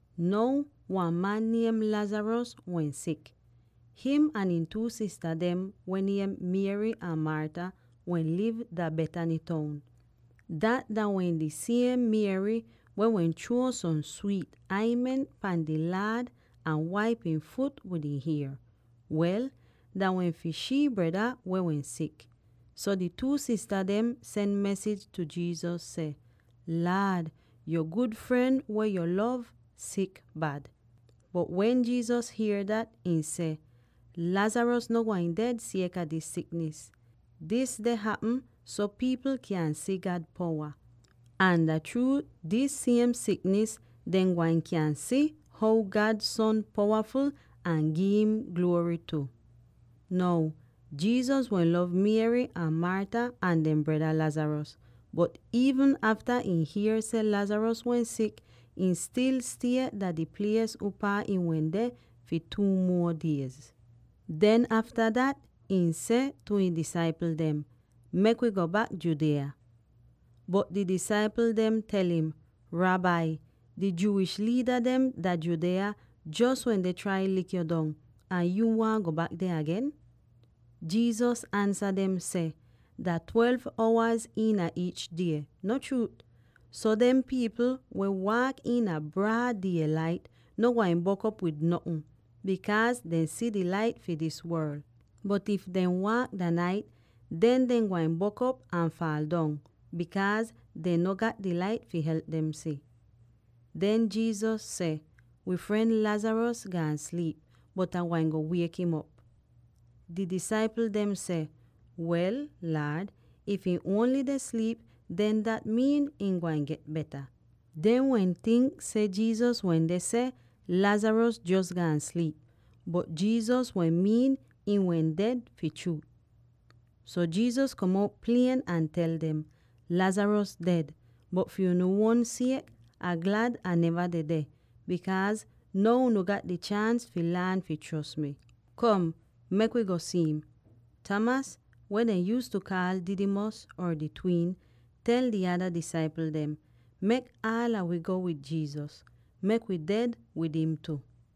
Now wan man niem Lazarus wehn sik. Him ahn ihn two sista dem, weh niem Mary ahn Martha, wehn liv dah Bethany toun. Dat dah wehn di siem Mary weh wehn chruo som swiit aintment pahn di Laad ahn waip ihn fut wid ihn hier. Wel, dah wehn fi shii breda weh wehn sik. So di two sista dem sen mesij tu Jesus seh, “Laad, yo gud fren weh yo lov sik bad.” Bot wen Jesus hier dat, ihn seh, “Lazarus no gwain ded sieka dis siknis. Dis deh hapm so pipl kyan si God powa, ahn dah chruu dis siem siknis dehn gwain kyan si how God Son powaful ahn gi'im gluory tu.” Now Jesus wehn lov Mary ahn Martha ahn dehn breda Lazarus, bot iivn afta ihn hier seh Lazarus wehn sik, ihn stil stie dah di plies upaa ihn wende fi two muo diez. Den afta dat, ihn seh tu ihn disaipl dem, “Mek wi go bak Judea.” Bot di disaipl dem tel im, “Rabbi, di Jewish liida dem dah Judea jos wende trai lik yo dong, ahn yuu waahn go bak deh agen?” Jesus ansa dem seh, “Dah twelve owaz iina iich die, no chruut? So dem pipl weh waak iina braad die-lait no gwain bok'op wid notn, bikaaz dehn si di Lait fi dis worl. Bot if dehn waak dah nait, den dehn gwain bok'op ahn faal dong, bikaaz dehn no gat di Lait fi help dem si.” Den Jesus seh, “Wi fren Lazarus gaan sliip, bot Ah gwain go wiek'im op.” Di disaipl dem seh, “Wel, Laad, if ihn ongl deh sliip, den dat miin ihn gwain get beta.” Dehn wehn tink seh Jesus wende seh Lazarus jos gaan sliip, bot Jesus wehn miin ihn wehn ded, fi chruut. So Jesus kom out klier ahn tel dem, “Lazarus ded. Bot fi unu uon siek, Ah glad Ah neva dedeh, bikaaz now unu gat di chaans fi laan fi chros mi. Kom, mek wi go si'im.” Thomas, weh dehn yuuztu kaal Didymus, or di Twin, tel di ada disaipl dem, “Mek aala wi go wid Jesus; mek wi ded wid im tu!”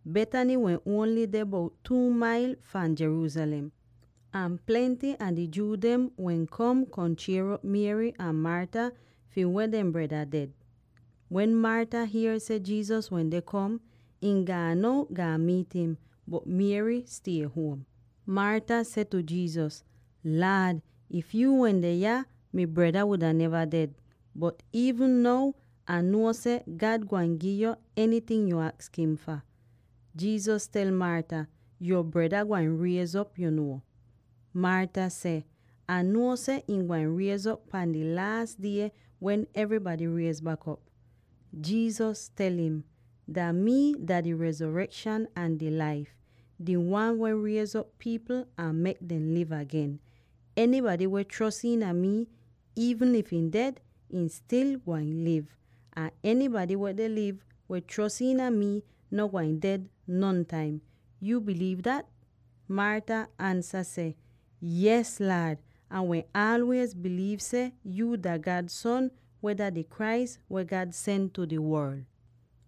Now Bethany wehn ongl deh bout two mailz fahn Jerusalem, ahn plenty a di Jew dem wehn kom, kom chier'op Mary ahn Martha fi weh dehn breda ded. Wen Martha hier seh Jesus wende kom, ihn gaan out gaan miit im, bot Mary stie huom. Martha seh tu Jesus, “Laad, if yu wende yah, mi breda wuda neva ded. Bot iivn now Ah nuo seh God gwain gi'yo enyting yu aks im fah.” Jesus tel Martha, “Yo breda gwain riez'op, yu nuo.” Martha seh, “Ah nuo seh ihn gwain riez'op pahn dah Laas Die wen evrybady riez bak op.” Jesus tel im, “Dah mii dah di Rezorekshan ahn di Laif, di Wan weh riez'op pipl ahn mek dem liv agen. Enybady weh chros iina mii —iivn if ihn ded— ihn stil gwain liv; ahn enybady weh deh liv, weh chros iina mii, no gwain ded nontaim. Yuu biliiv dat?” Martha ansa seh, “Yees Laad! Ah wehn aalwiez biliiv seh yuu dah God Son, weh dah di Christ weh God sen tu di worl.”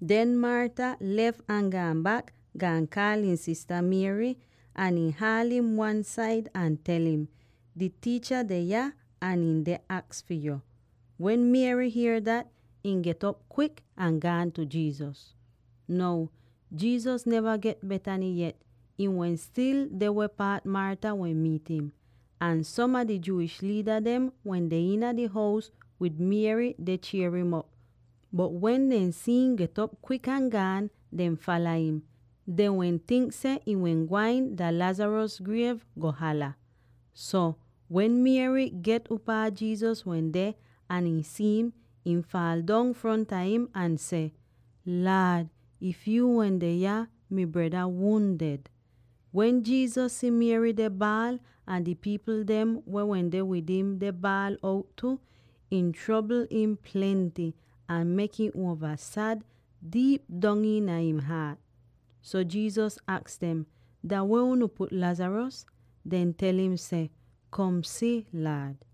Den Martha lef ahn gaan bak, gaan kaal ihn sista Mary, ahn ihn haal'im wan-said ahn tel im, “Di Tiicha deh yah ahn ihn deh aks fi yo.” Wen Mary hier dat, ihn get'op kwik ahn gaan tu Jesus. Now Jesus neva get Bethany yet; ihn wehn stil deh weh paat Martha wehn miit im. Ahn som a di Jewish liida dem wende iina di hous wid Mary deh chier'im op, bot wen dehn si'im get'op kwik ahn gaan, dehn fala im. Dehn wehn tink seh ihn wehn gwain dah Lazarus griev, go hala. So, wen Mary get upaa Jesus wende ahn ihn si'im, ihn faal dong fronta im ahn seh, “Laad, if yuu wende yah, mi breda wudn ded.” Wen Jesus si Mary deh baal, ahn di pipl dem weh wende wid im deh baal out tu, ih trobl im plenty ahn mek im uova sad diip dong iina ihn haat. So, Jesus aks dem, “Dah weh unu put Lazarus?” Dehn tel im seh, “Kom si, Laad.”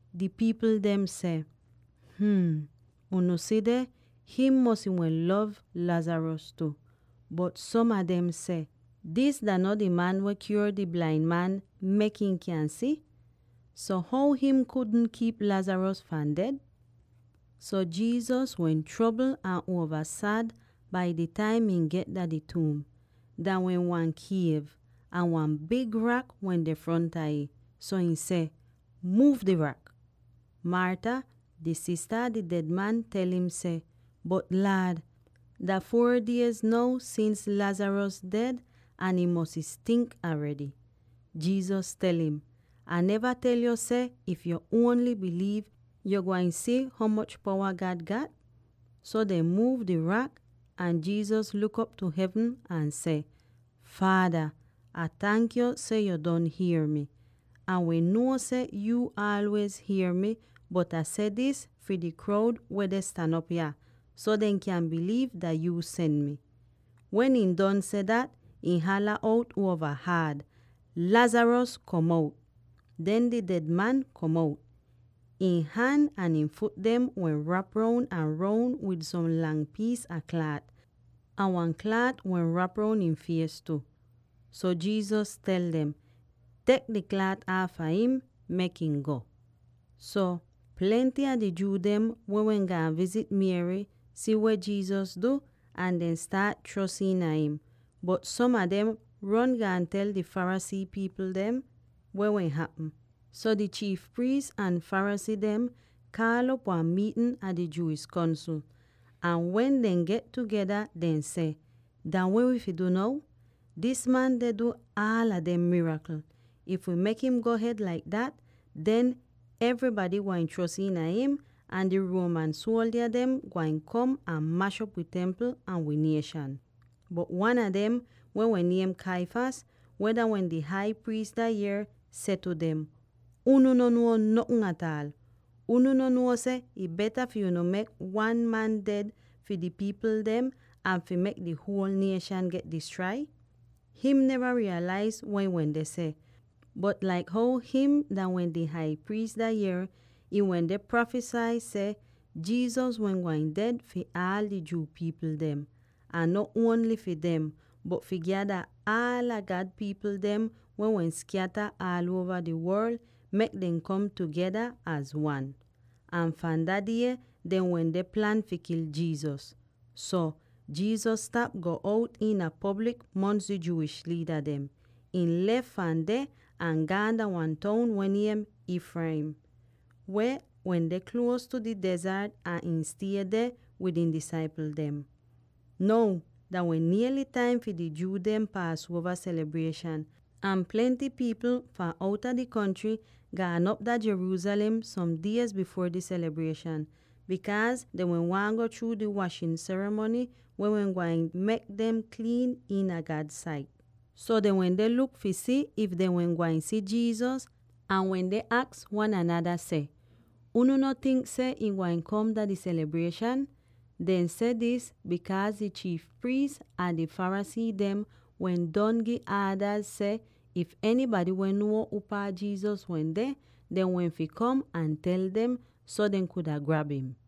Di pipl dem seh, “Hm, unu si deh; him mosy wehn lov Lazarus tu.” Bot som a dem seh, “Dis dah no di man weh kyuor di blain man, mek ihn kyan si? So, how him kudn kiip Lazarus fahn ded?” So Jesus wehn trobl ahn uova sad bai di taim ihn get dah di tuum. Dah wehn wan kiev, ahn wan big rak wende fronta ih. So ihn seh, “Muuv di rak!” Martha, di sista a di ded man, tel im seh, “Bot Laad, dah four diez now sins Lazarus ded ahn ihn mosy stink aredy.” Jesus tel im, “Ah neva tel yo seh, if yu ongl biliiv, yo gwain si ho moch powa God gat?” So dehn muuv di rak, ahn Jesus luk op tu hevn ahn seh, “Faada, Ah tank yo seh yo don hier mi. Ah wehn nuo seh yu aalwiez hier mi, bot Ah seh dis fi di kroud weh deh stan op yah, so dehn kyan biliiv dah yuu sen mi.” Wen ihn don seh dat, ihn hala out uova haad, “Lazarus, kom out!” Den di ded man kom out! Ihn han ahn ihn fut dem wehn rap roun ahn roun wid som lang piis a klaat, ahn wan klaat wehn rap roun ihn fies tu. So Jesus tel dem, “Tek di klaat aafa him; mek ihn go.” So, plenty a di Jew dem —weh wehn gaan vizit Mary— si weh Jesus du, ahn dehn staat chros iina im. Bot som a dem ron gaan tel di Pharisee pipl dem weh wehn hapm. So di chiif priis ahn Pharisee dem kaal'op wan miitn a di Jewish Kongsl; ahn wen dehn get tugeda, dehn seh, “Dah weh wi fi du now? Dis man deh du aala dem mirakl. If wi mek him go hed laik dat, den evrybady gwain chros iina im, ahn di Roman suoldya dem gwain kom ahn mash'op wi Templ ahn wi nieshan.” Bot wan a dem weh wehn niem Caiphas, weh dah wehn di Hai Priis dah yier, seh tu dem, “Unu no nuo notn ataal! Unu no nuo seh ih beta fi unu mek wan man ded fi di pipl dem an fi mek di huol nieshan get distrai?” Him neva riiyalaiz weh ihn wende seh, bot laik how him dah wehn di Hai Priis dah yier, ihn wende prafisai seh Jesus wehn gwain ded fi aal di Jew pipl dem —ahn no ongl fi dem— bot fi gyada aala God pipl dem weh wehn skyata aal uova di worl, mek dem kom tugeda az wan. Ahn fahn dah die, dehn wende plan fi kil Jesus. So, Jesus stap go bout iina poblik mongs di Jewish liida dem. Ihn lef fahn deh ahn gaan dah wan toun weh niem Ephraim, weh wende nier tu di dezart, ahn ihn stie deh wid ihn disaipl dem. Now dah wehn niely taim fi di Jew dehn Paasuova selibrieshan. Ahn plenty pipl fahn outa di kontry gaan op dah Jerusalem som diez bifuor di selibrieshan, bikaaz dehn wehn waahn go chruu di washin serimony weh wehn gwain mek dem kliin iina God sait. So dehn wende luk fi si if dehn wehn gwain si Jesus ahn wende aks wan anada seh, “Unu no tink seh ihn gwain kom dah di selibrieshan?” Dehn seh dis bikaaz di chiif priis ahn di Pharisee dem wehn don gi aadaz seh if enybady wehn nuo upaa Jesus wende, dehn wehn fi kom ahn tel dem so dehn kuda grab im.